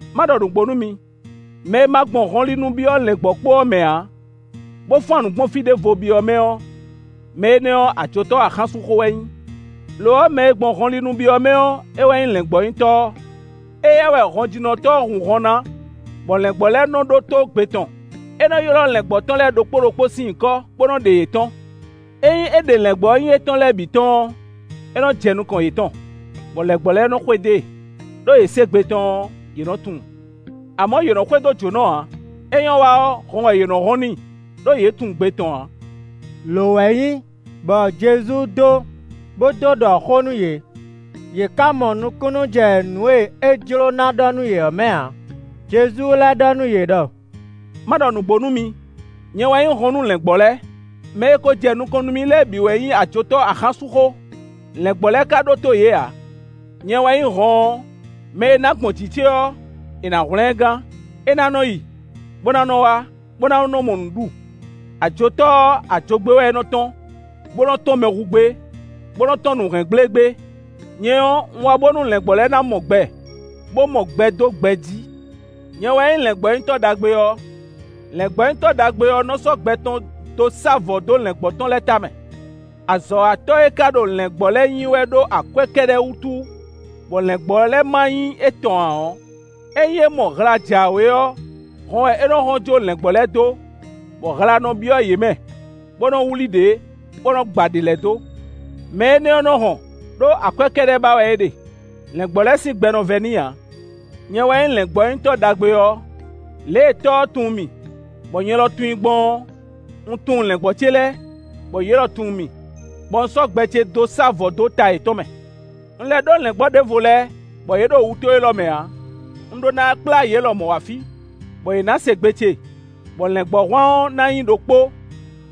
“Má ɖɔ nǔgbó nú mi: mɛ e ma gbɔn hɔnlinu byɔ́ lɛ̌ngbɔ́kpó ɔ́ mɛ ǎ, bó fán nǔ gbɔn fí ɖěvo byɔ́ mɛ ɔ́, mɛ énɛ́ ɔ́, ajotɔ́ axánsúnxó wɛ é nyí. Lo ɔ́, mɛ e gbɔn hɔnlinu byɔ́ mɛ ɔ́, é wɛ nyí lɛ̌ngbɔ́nyitɔ́ ɔ́. Éyɛ́ wɛ hɔnjínɔtɔ́ nɔ hun hɔn ná, bɔ lɛ̌ngbɔ́ lɛ́ɛ nɔ ɖótó gbe tɔn; é nɔ́ ylɔ́ lɛ̌ngbɔ́ tɔn lɛ́ɛ ɖokpó ɖokpó sín nyǐkɔ, bó nɔ́ ɖe yě tɔ́n. Ényí é ɖe lɛ̌ngbɔ́ e nyí étɔn lɛ́ɛ bǐ tɔ́n ɔ́, é nɔ́ jɛ nukɔn yětɔn, bɔ lɛ̌ngbɔ́ lɛ́ɛ nɔ xwedó e; ɖó yě se gbe tɔn ɔ́, yě nɔ́ tunwun. Amɔ̌, yě nɔ xwedó jǒnɔ ǎ; é nyɔ́ wa ɔ́, hɔn wɛ yě nɔ hɔn n'i; ɖó yě tunwun gbe tɔn ǎ.” Lǒ wɛ nyí bɔ Jezu dó bó dó ɖɔ xó nú yě, yě ká mɔ nukúnnú jɛ nǔ e é jlǒ ná ɖɔ nú yě ɔ́ mɛ ǎ. Jezu lɛ́ ɖɔ nú yě ɖɔ: “Má ɖɔ nǔgbó nú mi: nyɛ wɛ nyí hɔn nú lɛ̌ngbɔ́ lɛ́ɛ. Mɛ e ko jɛ nukɔn nú mì lɛ́ɛ bǐ wɛ nyí ajotɔ́ axánsúnxó, lɛ̌ngbɔ́ lɛ́ɛ ka ɖótó yě ǎ. Nyɛ wɛ nyí hɔn ɔ́. Mɛ e ná gbɔn jǐ ce ɔ́, è nǎ hwlɛ́n ɛ gán; é ná nɔ́ yi, bó ná nɔ́ wá, bó ná nɔ́ mɔ nǔ ɖu. Ajotɔ́ ɔ́, ajogbé wɛ é nɔ́ tɔ́n, bó nɔ́ tɔ́n mɛ hu gbé, bó nɔ́ tɔ́n nǔ hɛn gblé gbé. Nyɛ ɔ́, un wá bónú lɛ̌ngbɔ́ lɛ́ɛ ná mɔ gbɛ, bó mɔ gbɛ dó gbɛ jí. “Nyɛ wɛ nyí lɛ̌ngbɔ́nyitɔ́ ɖagbe ɔ́, lɛ̌ngbɔ́nyitɔ́ ɖagbe ɔ́ nɔ́ sɔ́ gbɛ tɔn dó sá vɔ̌ dó lɛ̌ngbɔ́ tɔn lɛ́ɛ tamɛ. Azɔ̌watɔ́ e ka ɖo lɛ̌ngbɔ́ lɛ́ɛ nyi wɛ ɖó akwɛ́ kɛ́ɖɛ́ wútu, bɔ lɛ̌ngbɔ́ lɛ́ɛ ma nyí étɔn ǎ ɔ́, ényí é mɔ hla jǎwe ɔ́, hɔn wɛ é nɔ hɔn jó lɛ̌ngbɔ́ lɛ́ɛ dó, bɔ hla nɔ byɔ́ yě mɛ, bó nɔ́ wlí ɖě, bó nɔ́ gba ɖě lɛ́ɛ dó. Mɛ énɛ́ ɔ́ nɔ hɔn, ɖó akwɛ́ kɛ́ɖɛ́ ba wɛ é ɖe. Lɛ̌ngbɔ́ lɛ́ɛ sín gbɛ nɔ vɛ́ n'i ǎ. Nyɛ wɛ nyí lɛ̌ngbɔ́nyitɔ́ ɖagbe ɔ́. Lě e Tɔ́ ɔ́ tunwun mì, bɔ nyɛ lɔ tunwun i gbɔn ɔ́, un tunwun lɛ̌ngbɔ́ ce lɛ́ɛ, bɔ yě lɔ tunwun mì, bɔ un sɔ́ gbɛ ce dó sá vɔ̌ dó ta yětɔn mɛ. Un lɛ́ ɖó lɛ̌ngbɔ́ ɖěvo lɛ́ɛ bɔ yě ɖo wutó élɔ́ mɛ ǎ; un ɖó ná kplá yě lɔmɔ̌ wá fí, bɔ yě ná se gbe ce, bɔ lɛ̌ngbɔ́hwan ɔ́ ná nyí ɖokpó,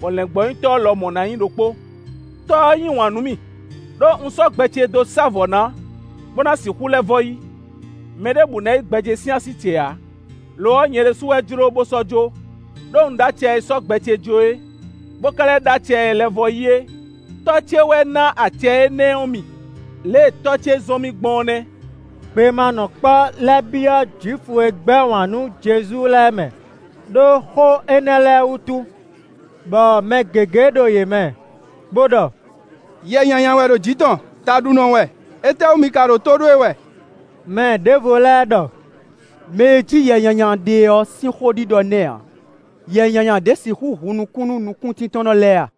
bɔ lɛ̌ngbɔ́nyitɔ́ lɔmɔ̌ ná nyí ɖokpó. “Tɔ́ ɔ́ yí wǎn nú mì, ɖó un sɔ́ gbɛ ce dó sá vɔ̌ ná, bó ná sixú lɛ́ vɔ́ yí. Mɛɖěbǔ ná yí gbɛ ce sín así ce ǎ; lo ɔ́, nyɛ ɖésú wɛ jló bó sɔ́ jó; ɖó un ɖó acɛ e sɔ́ gbɛ ce jó é, bó ka lɛ́ ɖó acɛ e lɛ́ vɔ́ yí é. Tɔ́ ce wɛ ná acɛ énɛ́ ɔ́ mì. Lě e Tɔ́ ce zɔ́n mì gbɔn ɔ́ nɛ́.” Gbemanɔkpɔ́ lɛ́ byɔ́ Jwifu e gbɛ́ wǎn nú Jezu lɛ́ɛ mɛ, ɖó xó énɛ́ lɛ́ɛ wútu. Bɔ mɛ gěgé ɖo yě mɛ, bó ɖɔ: “Yɛ nyanya wɛ ɖo jǐ tɔn; taɖunɔ wɛ; étɛ́wú mi ka ɖo tó ɖó e wɛ?” Mɛ ɖěvo lɛ́ɛ ɖɔ: “Mɛ e jí yɛ nyanya ɖe ɔ́ sín xó ɖiɖɔ nɛ́ ǎ; yɛ nyanya ɖě sixú hun nukún nú nukúntíntɔ́nnɔ lɛ́ɛ a?”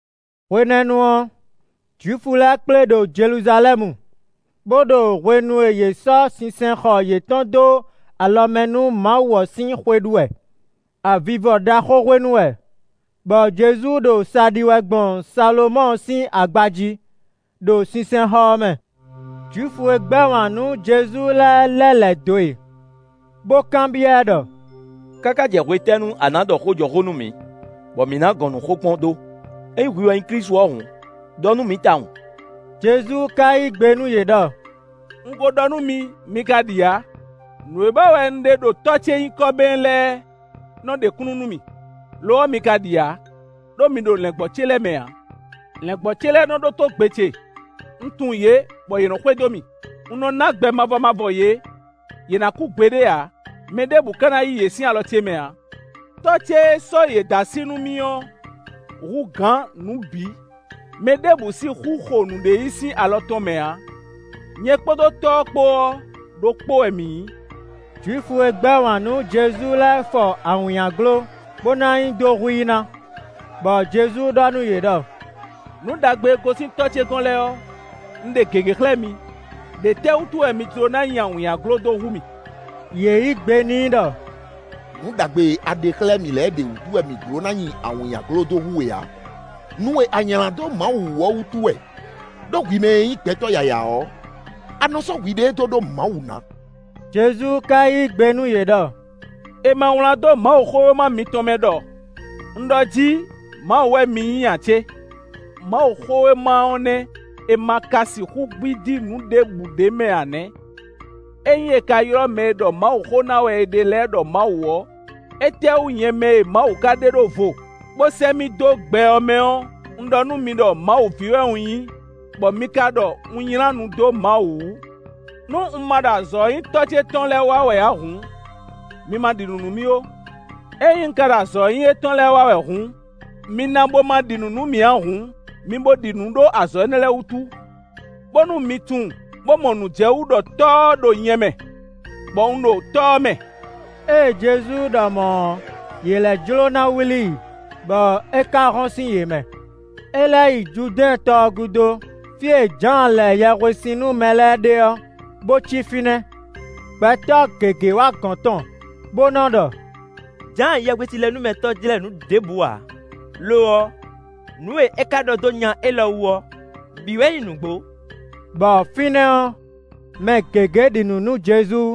Hwenɛ́nu ɔ́, Jwifu lɛ́ɛ kplé ɖo Jeluzalɛ́mu, bó ɖo hwenu e yě sɔ́ sinsɛnxɔ yětɔn dó alɔ mɛ nú Mawu ɔ́ sín xwe ɖu wɛ. Avivɔ ɖaxó hwenu wɛ, bɔ Jezu ɖo sa ɖi wɛ gbɔn Salomɔ́ɔ sín agba jí, ɖo sinsɛnxɔ ɔ́ mɛ. Jwifu e gbɛ́ wǎn nú Jezu lɛ́ɛ lɛ́ lɛ̌ dó e, bó kanbyɔ́ ɛ ɖɔ: “Káká jɛ hwetɛ́nu a nǎ ɖɔ xó jɔ xó nú mǐ, bɔ mǐ ná gɔn nǔ xokpɔ́n dó? Ényí hwi wɛ nyí Klísu ɔ́ hǔn, ɖɔ nú mǐ tawun.” Jezu ka yí gbe nú yě ɖɔ: “Un ko ɖɔ nú mi, mi ka ɖi ǎ. Nǔ e wa wɛ un ɖe ɖo Tɔ́ ce nyǐkɔ mɛ lɛ́ɛ nɔ ɖe kúnnu nú mì. Lo ɔ́ mi ka ɖi ǎ, ɖó mi ɖo lɛ̌ngbɔ́ ce lɛ́ɛ mɛ ǎ. Lɛ̌ngbɔ́ ce lɛ́ɛ nɔ ɖótó gbe ce, un tunwun yě bɔ yě nɔ xwedó mì. Un nɔ ná gbɛ mavɔ mavɔ yě; yě ná kú gbeɖé ǎ; mɛ ɖěbǔ ka ná yí yě sín alɔ ce mɛ ǎ. Tɔ́ ce e sɔ́ yě dó así nú mì ɔ́, hú gǎn nǔ bǐ, mɛ ɖěbǔ sixú xo nǔɖé yí sín alɔ tɔn mɛ ǎ. Nyɛ kpódó Tɔ́ ɔ́ kpó ɔ́, ɖokpó wɛ mǐ nyǐ.” Jwifu e gbɛ́ wǎn nú Jezu lɛ́ɛ fɔ awǐnnyaglo bó ná nyi dó hu i ná, bɔ Jezu ɖɔ nú yě ɖɔ: “Nǔ ɖagbe e gosín Tɔ́ ce gɔ́n lɛ́ɛ ɔ́, un ɖe gěgé xlɛ́ mi; ɖě tɛ́ wútu wɛ mi jló ná nyi awǐnnyaglo dó hu mì?” Yě yí gbe n'i ɖɔ: “Nǔ ɖagbe e a ɖe xlɛ́ mǐ lɛ́ɛ ɖě wútu wɛ mǐ jló ná nyi awǐnnyaglo dó hu we ǎ, nu e a nylǎ dó Mawu wú ɔ́ wútu wɛ. Đó hwi mɛ e nyí gbɛtɔ́ yǎyá ɔ́, a nɔ sɔ́ hwiɖée dó ɖó Mawu ná.” Jezu ka yí gbe nú yě ɖɔ: “È ma wlán dó Mawuxówéma mitɔn mɛ ɖɔ: ‘Un ɖɔ jí: mawu wɛ mi nyí’ ǎ cé? Mawuxówéma ɔ́ nɛ́ è ma ka sixú gbídí nǔ ɖěbǔ ɖ'é mɛ ǎ nɛ́. Ényí è ka ylɔ́ mɛ e ɖɔ Mawuxó ná wɛ è ɖe lɛ́ɛ ɖɔ mawu ɔ́, étɛ́wú nyɛ mɛ e Mawu ka ɖe ɖó vo, bó sɛ́ mì dó gbɛ ɔ́ mɛ ɔ́, un ɖɔ nú mi ɖɔ Mawu ví wɛ un nyí, bɔ mi ka ɖɔ un nylá nu dó Mawu wú? Nú un ma ɖo azɔ̌ e nyí Tɔ́ ce tɔn lɛ́ɛ wa wɛ ǎ hǔn, mi ma ɖi nǔ nú mì ó. Ényí un ka ɖo azɔ̌ e nyí étɔn lɛ́ɛ wa wɛ hǔn, mi na bo ma ɖi nǔ nú mì ǎ hǔn, mi bo ɖi nǔ ɖó azɔ̌ énɛ́ lɛ́ɛ wútu. Bónú mi tunwun, bó mɔ nǔ jɛ wú ɖɔ Tɔ́ ɔ́ ɖo nyɛ mɛ, bɔ un ɖo Tɔ́ ɔ́ mɛ.” Ée Jezu ɖɔ mɔ̌ ɔ́, yě lɛ́ jló ná wlí i, bɔ é ka hɔn sín yě mɛ. É lɛ́ yi Judɛ́ɛn tɔ gúdo, fí e Jǎan lɛ yɛhwesin nú mɛ lɛ́ɛ ɖe ɔ́, bó cí fínɛ́. Gbɛtɔ́ gěgé wá gɔ̌n tɔn bó nɔ́ ɖɔ: “Jǎan Yɛhwesinlɛnúmɛtɔ́ jlɛ́ nǔ ɖěbǔ ǎ; lo ɔ́, nǔ e é ka ɖɔ dó nya élɔ́ wú ɔ́ bǐ wɛ nyí nǔgbó.” Bɔ fínɛ́ ɔ́, mɛ gěgé ɖi nǔ nú Jezu.